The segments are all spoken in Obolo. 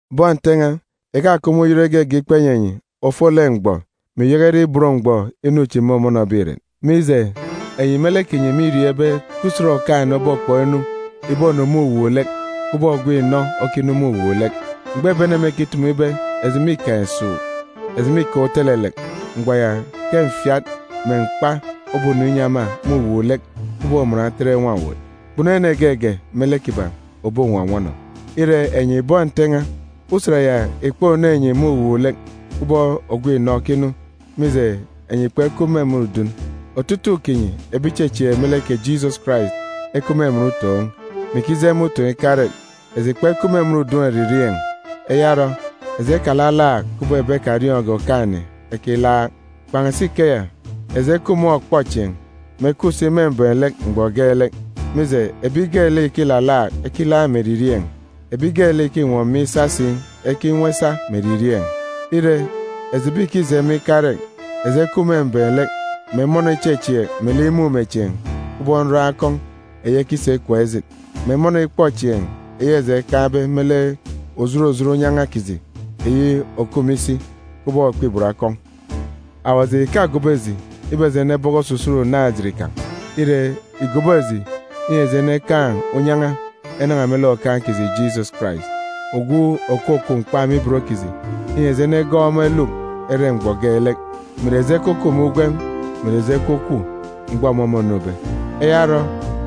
Bọn Nte n̄a, ìkakup me uyọt igege ikpa inyi enyi ofolek mgbọ, mè ìyaka ire ibot mgbọ, inu chi mômọnọbe irek, mije, enyi me lek kinyi mîriọọn̄ ibe ke Usen Okaan̄-ene obokpọk inu ìbonu me uwuuk-lek kubọk ogwu inọ okinu me uwuuk-lek. Mgbọ ebi ene mêkitumu ibe, “Eji mîkaan̄ esuuk! Eji mîkaan̄ utelelek!” mgbọ ya ke mfiat mè mkpa obonu inyi ema me uwuuk-lek kubọk uman otet nwa-owot. Kpunu ene geege me lek kiban̄ òbonwọnwọnọ. Ire, enyi bọn Nte n̄a, Usen ya ìkponu enyi me uwuuk-lek kubọk ogwu inọ okinu, mije, enyi kpekup me emen udun. Otutuuk kinyi ebi ìchechieek me lek kè Jisọs Karais ekup me emen utoon̄, mè ikije me utoon̄ ikarek. Eji kpekup me emen udun eririeen̄. Eya orọ, eji ekalalaak, kubọk ebi ekariọọn̄ge Okaan̄-ene ekilaak. Kpan̄asi ikeya, eji ekup me ọkpọchieen̄, mè ekup si me mbem-lek mgbọ geelek. Mije, ebi geelek ìkilalaak, ekilaak me eririeen̄, ebi geelek ìkinwọ miin̄ isa si, ekinwọ isa me eririeen̄. Ire, eji ebi ìkije me ikarek, eji ekup me mbem-lek, mè emọnọ ichechieek melek imumechieen̄ kubọk nroon̄ akọn̄ eyi ekisa ikwek ejit, mè emọnọ ikpọchieen̄ eyi eji ekaan̄be me lek òjot òjot unyan̄a kiji eyi òkup me isi, kubọk okpibot akọn̄. Awaji ìkagobo eji ibe eji enebọkọ osusut unaan̄-ejit kan̄. Ire, ìgobo eji inyi eji enekaan̄ unyan̄a enan̄a me lek Okaan̄ kiji Jisọs Karais, ogwu òkwukwu mkpa me ibot kiji, inyi eji enegọọk ọmọ eluk ere mgbọ geelek, mè ìre eji ekukup me ugwem, mè ìre eji ekwukwu, mgbọ ọmọ mônube. Eya orọ,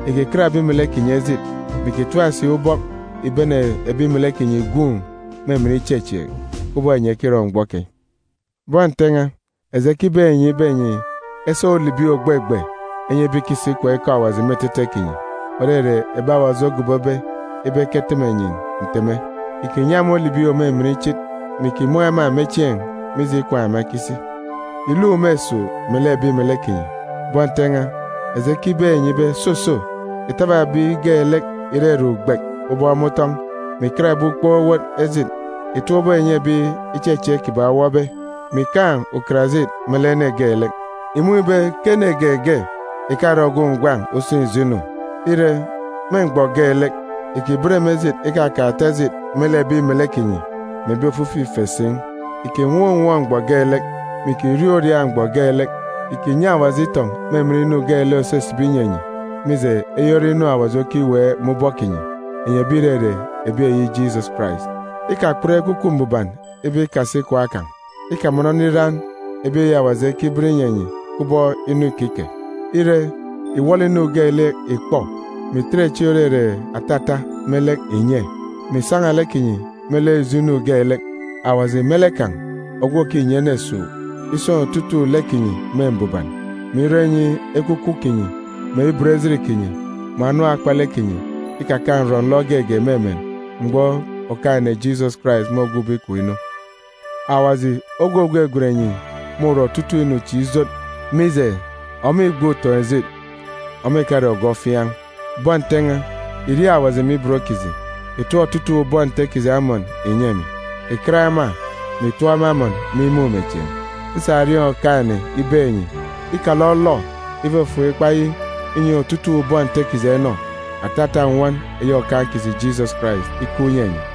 ìkikat ebi melek kinyi ejit, mè ìkitap si ubọk ìbene ebi melek kinyi ìgwuun̄ me emen ichechieek, kubọk enyi ekirọ mgbọ keyi. Bọn Nte n̄a, eji ekibeek enyi ibe enyi esa ulibi ògbegbe enyi ebi ìkisi ikwaan̄ ikọ Awaji me etete kinyi, òrere ebi Awaji ogobobe ibe eketeme enyi nteme. Ìkinyi ema ulibi òmimin ichit, mè ìkimun̄ ema me chieen̄, mije ikwaan̄ ema ekisi. Ìluk me esuuk melek ebi melek kinyi. Bọn Nte n̄a, eji ekibeek enyi ibe, soso, ìtaba ebi geelek ìrere ugbek ubọk me utọn̄, mè ìkat ebi ukpook owot ejit. Ìtap ubọk ìnyi ebi ichechieek kiban̄ owọbe, mè ìkaan̄ ukarajit me lek ene geelek. Ìmun̄ ibe ke ene geege ìkarọ ogwu ngwan̄ useen̄ ijo inu. Ire, me mgbọ geelek, ìkiben me ejit ikakaan̄ ata ejit me lek ebi melek kinyi mè ebi ofifi ife si. Ìkinwọọn̄ unwọọn̄ mgbọ geelek, mè ìkiriaak uriaak mgbọ geelek. Ìkinyi Awaji itọn̄ me emen inu geelek òsisibi inyi enyi, mije, eyi ore inu Awaji okiweek me ubọk kinyi, enyi ebi ìrere ebi eyi Jisọs Karais. Ikakput Ekwukwu Mbuban ibe ikasi ikwaan̄ kan̄. Ikamọnọ nriran ebi eyi Awaji ekiben inyi enyi kubọk inu ikike. Ire, ìwọlọ inu geelek ìkpọ, mè ìtet echi òrere atata me lek ìnye, mè ìsan̄a lek kinyi me lek ijo inu geelek. Kè Awaji me lek kan̄, ogwu òkinyi ene esuuk, isun̄ otutuuk lek kinyi me mbuban, me irọ inyi ekwukwu kinyi, mè ibot ejit kinyi, mè anam akpalek kinyi ikakaan̄ nrọ-nlọ geege me emen mgbọ Okaan̄-ene Jisọs Karais môgwube ikom inu. Awaji ogwu ògwegwen enyi môrọ otutuuk inu chi ijot, mije, ọmọ îgbe utoon̄-ejit, ọmọ ìkare ogwu ofiaan̄. Bọn Nte n̄a, ìriaak Awaji me ibot kiji. Ìtọp otutuuk bọn Nte kiji amọn ìnyi emi. Ìkat ema, mè itọp ema amọn me imumechieen̄. Nsa erieen̄ Okaan̄-ene ibeek enyi, ikalọlọ ifufuk ikpa yi inyi otutuuk bọn Nte kiji enọ. Atata nnwọn eyi Okaan̄ kiji Jisọs Karais ikup inyi enyi!